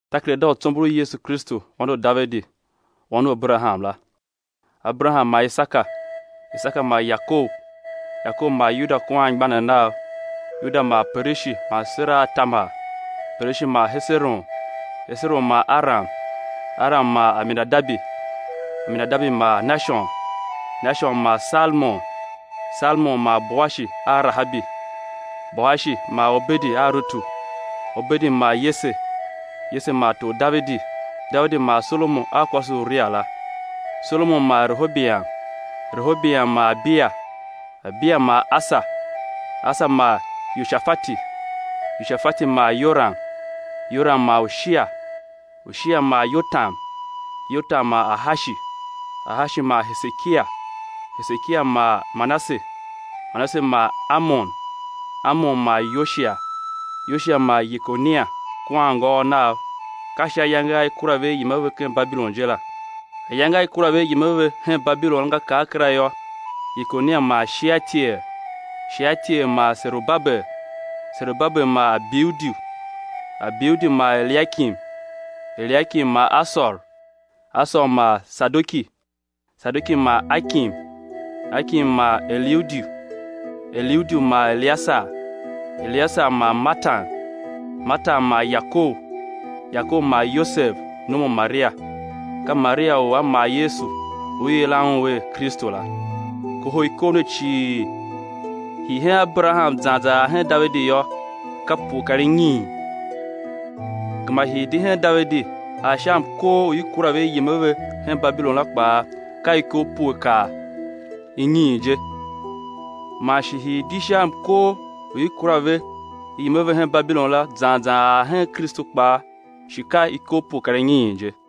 Takerada u tsombor u Yesu Kristu Wan u Davidi, wan u Aberaham la. Aberaham mar Isaka; Isaka mar Yakob; Yakob mar Yuda kua anmgbianev nav; Yuda mar Perishi man Sera a Tamar; Perishi mar Heseron mar Aram; Aram mar Aminadabi; Aminadabi mar Nashon; Nashon mar Salmon; Salmon mar Boashi a Rahabi; Boashi mar Obedi a Rutu; Obedi mar Yese; Yese mar tor Davidi; Davidi mar Solomon a kwase u Uria la; Solomon mar Rehobiam; Rehobiam mar Abiya; Abiya mar Asa; Asa mar Yoshafati; Yoshafati mar Yoram; Yoram mar Ushia; Ushia mar Yotam; Yotam mar Ahashi; Ahashi mar Hesekia; Hesekia mar Manase; Manase mar Amon; Amon mar Yoshia; Yoshia mar Yekonia kua anngôôv nav, ka sha ayange a i kura ve i yem a ve hen Babilon je la. Ayange a i kura ve i yem a ve hen Babilon la nga kar kera yô; Yekonia mar Shealtiel; Shealtiel mar Serubabel; Serubabel mar Abiudi; Abiudi mar Eliakim; Eliakim mar Asor; Asor mar Sadoki; Sadoki mar Akim; Akim mar Eliudi; Eliudi mar Eliasar; Eliasar mar Matan; Matan mar Yakob; Yakob mar Yosev, nom u Maria, ka Maria u a mar Yesu u i yilan Un er Kristu la. Kohol ikov ne cii, hii hen Aberaham zan zan ar hen Davidi yô, ka pue kar inyiin, gema hii di hen Davidi ar sha mkor u i kura ve i yem a ve hen Babilon la kpaa, ka ikov pue kar inyiin je, man shi hii di sha mkor u i kura ve i yem a ve hen Babilon la zan zan ar hen Kristu kpaa shi ka ikov pue kar inyiin je.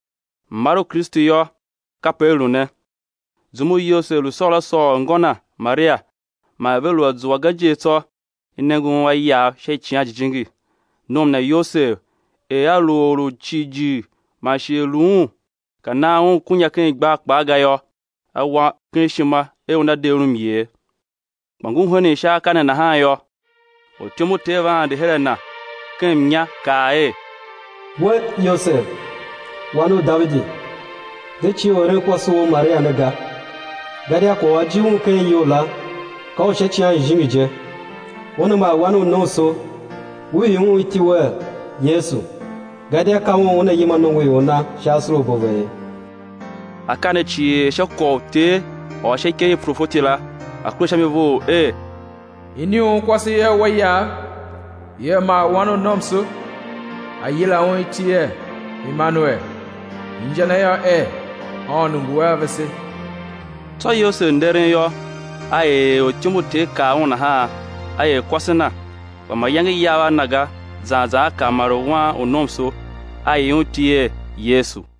Mmar u Kristu yô, kape a lu ne: Zum u Yosev lu sôôr ngô Na, Maria, man er ve lu a zua ga je tsô, i nenge un a iyav sha Icighan Jijingi. Nom na Yosev, er a lu or u jighjigh man shi er lu un ka nan un kunya ken igbar kpaa ga yô, a wa ken ishima er una de un myer. Kpa ngur henen sha akaa ne nahan yô, ortyom u Ter va ande her a na ken mnya, kaa er: We, Yosev, wan u Davidi, de cie u eren kwase wou Maria ne ga, gadia kwagh u a jil un ken iyol la, ka u sha Icighan Jijingi je. Una mar wan u nomso; ú ii Un iti wer, Yesu; gadia ka Un Una yima nongoior Na sha asorabo a ve ye. Akaa ne cii er sha u kwagh u Ter ôr sha ikev i profeti la, a̱ kure sha mi vough, er: Iniunkwase ia wa iyav, ia mar wan u nomso; á yila Un iti er Emanuel, inja na yô er, Aôndo ngu a vese. Tsô Yosev nderen yô, a er er ortyom u Ter kaa un nahan, a er kwase na; kpa mayange yav a na ga, zan zan a kar maren wan u nomso; a ii Un iti er Yesu.